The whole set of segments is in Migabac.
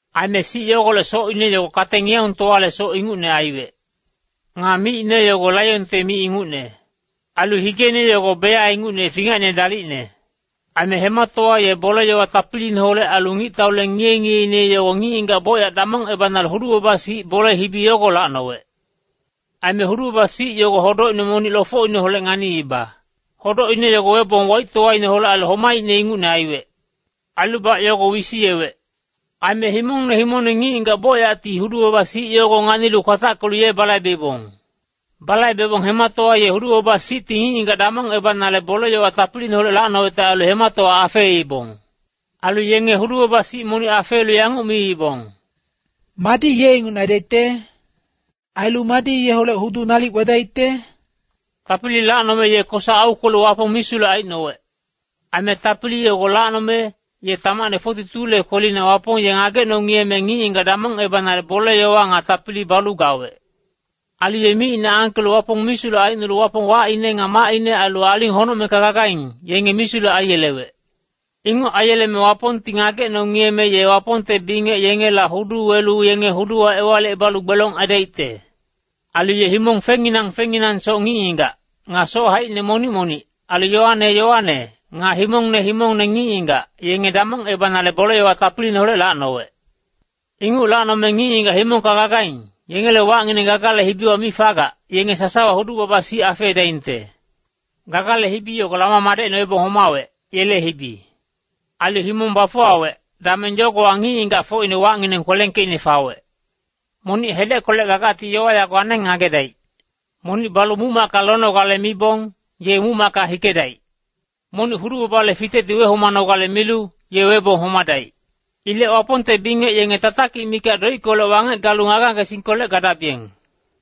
Aime sic yogolec socine yogo kate-ngiyaungtowale soc ingucne aiwec. Nga micine yogo laionte mic ingucne. Ailu higeine yogo beya ingucne fingacine dalicne. Aime hematowa ye bole-yowa tapiliineholec ailu ngictaule ngiye-ngiyeine yogo ngic-ngigac bocyac damongebanale hudu-baba-sic bole-hibi yogo lacnowec. Aime hudu-baba-sic yogo hodocine monic lofocineholec nganiiba. Hodocine yogo webong waictowaineholec ailu homaicne ingucne aiwec. Ailubac yogo wisiyewec. Aime himongne himongne ngic-ngigac bocyacti hudu-baba-sic yogo nganilu kwatackelu ye balaibeibong. Balaibebong hematowa ye hudu-baba-sicti ngic-ngigac damongebanale bole-yowa tapiliineholec lacnowecte ailu hematowa afeeibong. Ailu yenge hudu-baba-sic momoc afeelu yanguc miibong, “Madi ye ingucne aidaicte? Ailu madi yeholec hudu nalic wedaicte?” Tapili lacnome ye kosa aukwelu Wapong misulec aicnowec. Aime tapili yogo lacnome, ye tamacne 42le kwelina Wapong ye ngagecno-ngiyeme ngic-ngigac damongebanale bole-yowa nga tapili balu gawec. Ailu ye micine angkelu Wapong misulec aicnolu Wapong wacine nga macine ailu aling honocmengka gagaing, yenge misulec aiyelewec. Inguc aiyeleme Wapongti ngagecno-ngiyeme ye Wapongte bingec yengela hudu welu yenge huduwa ewalicebalu gbelong aidaicte. Ailu ye himong fengnginang fengnginangsoc ngic-ngigac, nga soc haicine monic-monic, ailu yowane yowane, nga himongne himongne ngic-ngigac, yenge damongebanale bole-yowa tapiliineholec lacnowec. Inguc lacnome ngic-ngigac himongka gagaing, yengele wacngineng Gagale hibiwa mi fagac, yenge sasawa hudu-baba-sic afeedaingte. Gagale hibi yogo Lama madecine webong homawec, yele hibi. Ailu himong bafuwawec, dameng yogowa ngic-ngigacfocine wacngineng kwelengkeicne fawec. Monic hedeckolec gagacti yowa yago aneng ngagedaic. Monic balu muc-macka lonogale mibong, ye muc-macka hikedaic. Monic hudu-babale fitecti wehomanogale milu, ye webong homadaic. Ilec Wapongte bingec yenge tatakic mikac doickolec wangec galu ngage-ngagesingkolec gadabiyeng.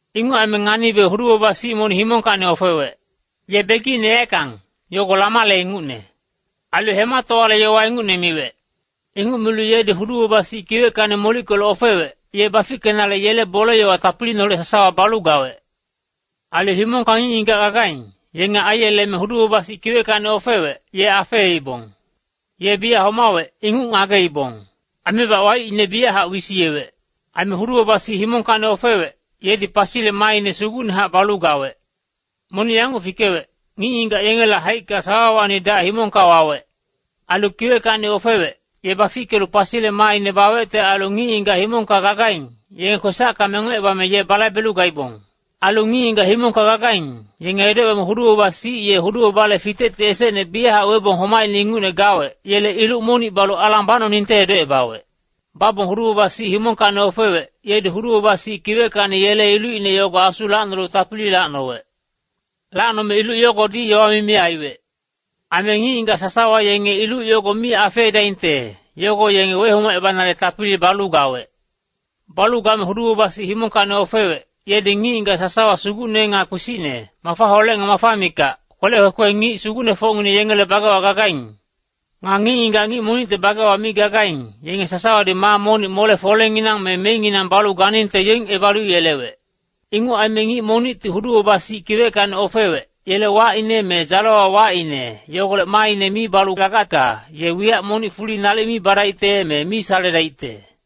Inguc aime nganibe hudu-baba-sic monic himongkacni ofewec. Ye begicine yaeckang, yogo lamale ingucne. Ailu hematowale yowa ingucne miwec. Inguc milu yedi hudu-baba-sic kiweckacni molickelu ofewec, ye bafickenale yele bole-yowa tapiliineholec sasawa balu gawec. Ailu himongka ngic-ngigac gagaing, yenge aiyeleme hudu-baba-sic kiweckacni ofewec, ye afeeibong. Ye biyac homawec, inguc ngageibong. Aimebac waicine biyachac wisiyewec. Aime hudu-baba-sic himongkacni ofewec, yedi pasile maaine sugucnehac balu gawec. Monic yanguc fikewec, ngic-ngigac yengele haicka sawawacni dac himongka wawec. Ailu kiweckacni ofewec, ye bafickelu pasile maaine bawecte ailu ngic-ngigac himongka gagaing, yenge kwesacka mengocebame ye balaibelu gaibong. Ailu ngic-ngigac himongka gagaing, yenge edocebame hudu-baba-sic ye hudu-babale fitecti esecne biyachac webong homaicne ingucne gawec, yele iluc monic balu alang bacnoningte edocebawec. Babong hudu-baba-sic himongkacni ofewec, yedi hudu-baba-sic kiweckacni yele ilucine yogo asu lacnonale tapili lacnowec. Lacnome iluc yogodi yowa mimi aiwec. Aime ngic-ngigac sasawa yenge iluc yogo mi afeedaingte, yogo yenge wehomacebanale tapili balu gawec. Balu game hudu-baba-sic himongkacni ofewec, yedi ngic-ngigac sasawa sugucne nga kpisicne, mafaholec nga mafa mikac, kwelec kwekwe ngic sugucnefocngineng yengele bagewa gagaing. Nga ngic-ngigac ngic monicte bagewa mi gagaing, yenge sasawadi maa monic mole-folenginang me meinginang balu ganingte yoingebalu yelewec. Inguc aime ngic monicti hudu-baba-sic kiweckacni ofewec, yele wacine me dzalewa wacine, yogolec maaine mi balu gagacka, ye wiyac monic fuli nalic mi badaicte, me mi saledaicte.